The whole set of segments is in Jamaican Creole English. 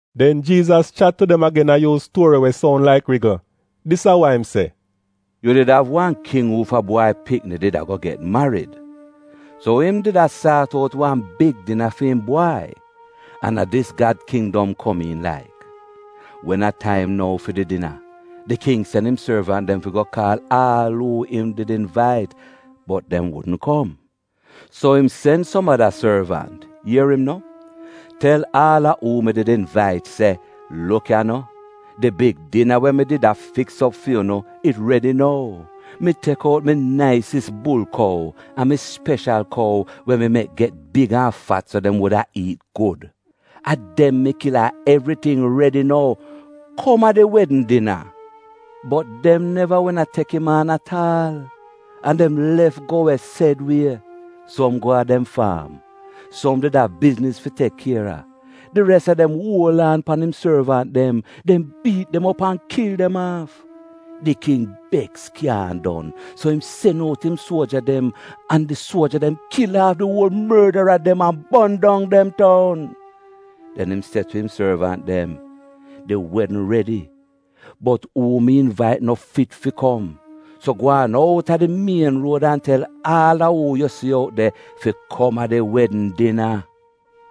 Den Jiizas chat tu dem agen a yuuz tuori we soun laik rigl. Dis a wa im se: “Yu did av wan king uufa bwai pikni did ago get marid. So im did a saat out wan big dina fi'im bwai — an a dis Gad kindom komiin laik. Wen a taim nou fi di dina, di king sen im sorvant dem fi go kaal aal uu im did invait, bot dem wudn kom. “So im sen som ada sorvant, ier im no, ‘Tel aal a uu mi did invait se, “Luk ya no, di big dina we mi did a fiks op fu'unu, it redi nou. Mi tek out mi naisis bulkou an mi speshal kou we mi mek get big an fat so dem wuda iit gud. A dem mi kil an evriting redi nou. Kom a di wedn dina.”’ “Bot dem neva wehn a tek im aan at aal, an dem lef go we sed wie. Som go a dem faam, som did av bizniz fi tek kier a. Di res a dem uol aan pan im sorvant dem. Dem biit dem op an kil dem aaf. Di king beks kyaahn don! So im sen out im suoja dem, an di suoja dem kil aaf di uol mordara dem an bon dong dem toun. “Den im se tu im sorvant dem se, ‘Di wedn redi bot uu mi invait no fit fi kom. So gwaan out a di mien ruod an tel aal uu yu si out de fi kom a di wedn dina.’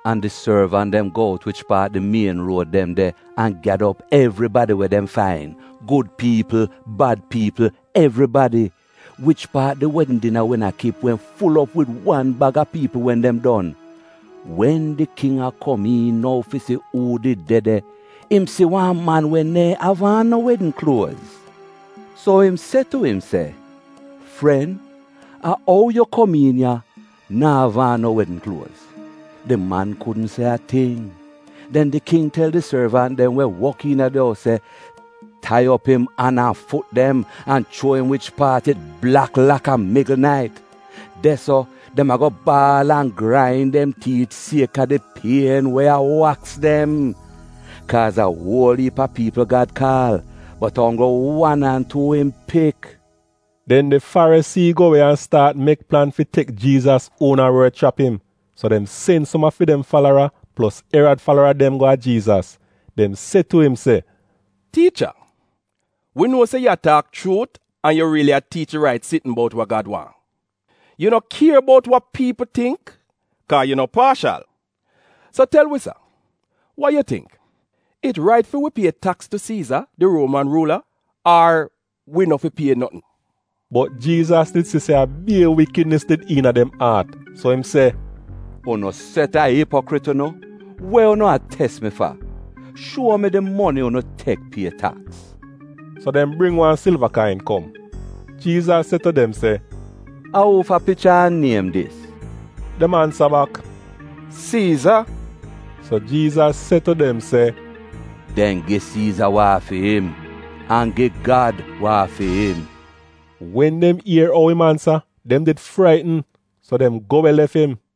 An di sorvant dem go out wich paat di mien ruod dem de an gyada op evribadi we dem fain: gud piipl, bad piipl — evribadi! Wich paat di wedn dina wehn a kip wehn ful op wid wan baga piipl wen dem don. “Wen di king a kom iin nou fi si uu did de de, im si wan man we neehn av aan no wedn kluoz. So im se tu im se, ‘Fren, a ou yu kom iin an yu na'av aan no wedn kluoz?’ Di man kudn se a ting. “Den di king tel di sorvant dem we wok iina di ous se, ‘Tai op im an an fut dem, an chuo im wich paat it blak laka migl nait. De-so, dem ago baal an grain dem tiit, sieka di pien we a waks dem.’ “Kaaz a uol iip a piipl Gad kaal, bot a onggl wan an tuu im pik.” Den di Farisii go we an staat mek plan fi tek Jiizas uona wod chrap im. So dem sen som a fi dem falara plos Erad falara dem go a Jiizas. Dem se tu im se, “Tiicha, wi nuo se yu a taak chuut an yu riili a tiich di rait sitn bout wa Gad waahn. Yu no kier bout wa piipl tingk, kaa yu no paashal. So tel wi sa, wa yu tingk, it rait fi wi pie taks tu Siiza, di Ruoman ruula, ar wi no fi pie notn?” Bot Jiizas did si se a bier wikidnis did iina dem aat, so im se, “Unu set a ipokrit unu! We unu a tes mi fa? Shuo mi di moni unu tek pie taks.” So dem bring wan silva kain kom. Jiizas se tu dem se, “A uu fa picha an niem dis?” Dem ansa bak, “Siiza.” So Jiizas se tu dem se, “Den gi Siiza wa a fi'im, an gi Gad wa a fi'im.” Wen dem ier ou im ansa, dem did fraitn. So dem go we lef im.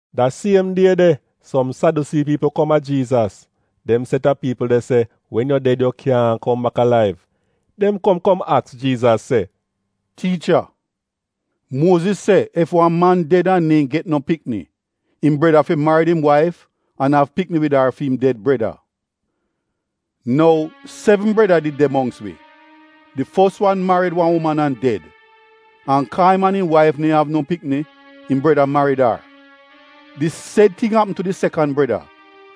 Da siem die de som Sadyusii piipl kom a Jiizas (dem set a piipl de se, wen yu ded yu kyaahn kom bak alaiv). Dem kom kom aks Jiizas se, “Tiicha, Muoziz se, ‘Ef wan man ded an neehn get no pikni, im breda fi marid im waif, an av pikni wid ar fi im ded breda.’ Nou sevn breda did de mongks wi. Di fos wan marid wan uman an ded, an kaa im an im waif neehn av no pikni, im breda marid ar. Di sed ting apm tu di sekan breda,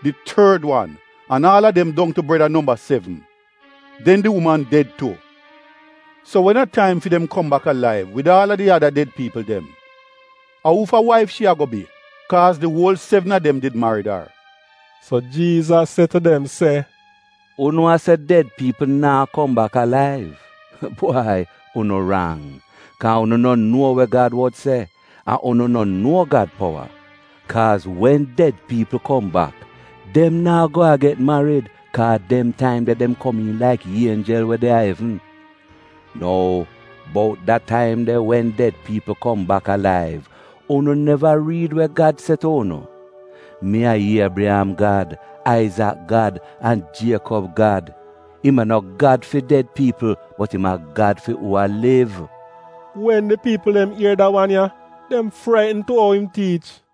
di tord wan, an aal a dem dong tu breda nomba sevn. Den di uman ded tu. So wen a taim fi dem kom bak alaiv, wid aal a di ada ded piipl dem, a uu fa waif shi ago bi? Kaaz di uol sevn a dem did marid ar.” So Jiizas se tu dem se, “Unu a se ded piipl naa kom bak alaiv — bwai unu rang, kaa unu no nuo we Gad wod se, an unu no nuo Gad powa. Kaaz wen ded piipl kom bak, dem naa go a get marid, kaa dem taim de dem komiin laik ienjel we de a evn. Nou bout da taim de wen ded piipl kom bak alaiv, unu neva riid we Gad se tu unu, ‘Mi a Iebriyam Gad, Aizak Gad an Jiekob Gad’? Im a no Gad fi ded piipl, bot im a Gad fi uu a liv!” Wen di piipl dem ier da wan ya, dem fraitn tu ou im tiich.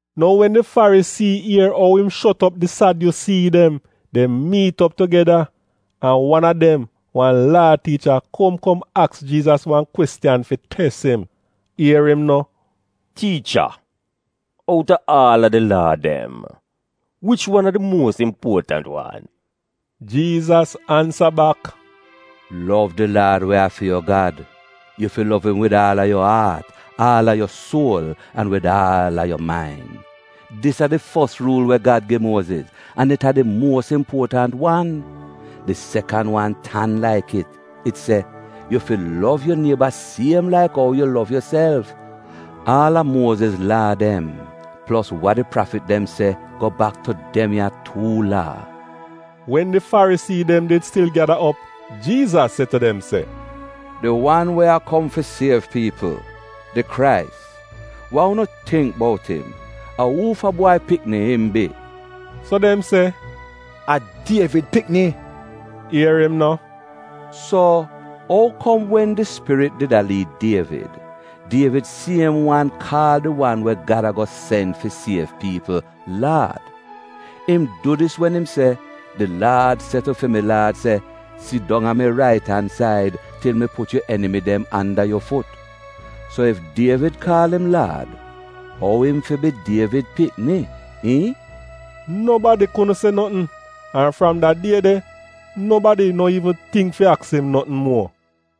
Nou wen di Farisii ier ou im shot op di Sadyusii dem, dem miit op tugeda. An wan a dem, wan Laa tiicha kom kom aks Jiizas wan kwestiyan fi tes im. Ier im no, “Tiicha, outa aal a di Laa dem, wich wan a di muos impuotant wan?” Jiizas ansa bak, “Lov di Laad we a fi yu Gad. Yu fi lov im wid aal a yu aat, aal a yu suol, an wid aal a yu main.’ Dis a di fos ruul we Gad gi Muoziz, an it a di muos impuotant wan. Di sekan wan tan laik it. It se, ‘Yu fi lov yu nieba siem laik ou yu lov yuself.’ Aal a Muoziz Laa dem, plos wa di prafit dem se go bak tu dem ya tuu Laa.” Wen di Farisii dem did stil gyada op, Jiizas se tu dem se, “Di wan we a kom fi siev piipl, di Krais, wa unu tingk bout im? A uufa bwai pikni im bi?” So dem se, “A Dievid pikni.” Ier im no, “So, ou kom wen di Spirit did a liid Dievid, Dievid siem wan kaal di wan we Gad a sen fi siev piipl, ‘Laad’? Im du dis wen im se, “‘Di Laad se tu fi mi Laad se: “Sidong a mi rait-an-said til mi put yu enimi dem anda yu fut”’ So ef Dievid kaal im ‘Laad,’ ou im fi bi Dievid pikni? iihn?” Nobadi kudn se notn, an fram da die de, nobadi no iivn tingk fi aks im notn muo.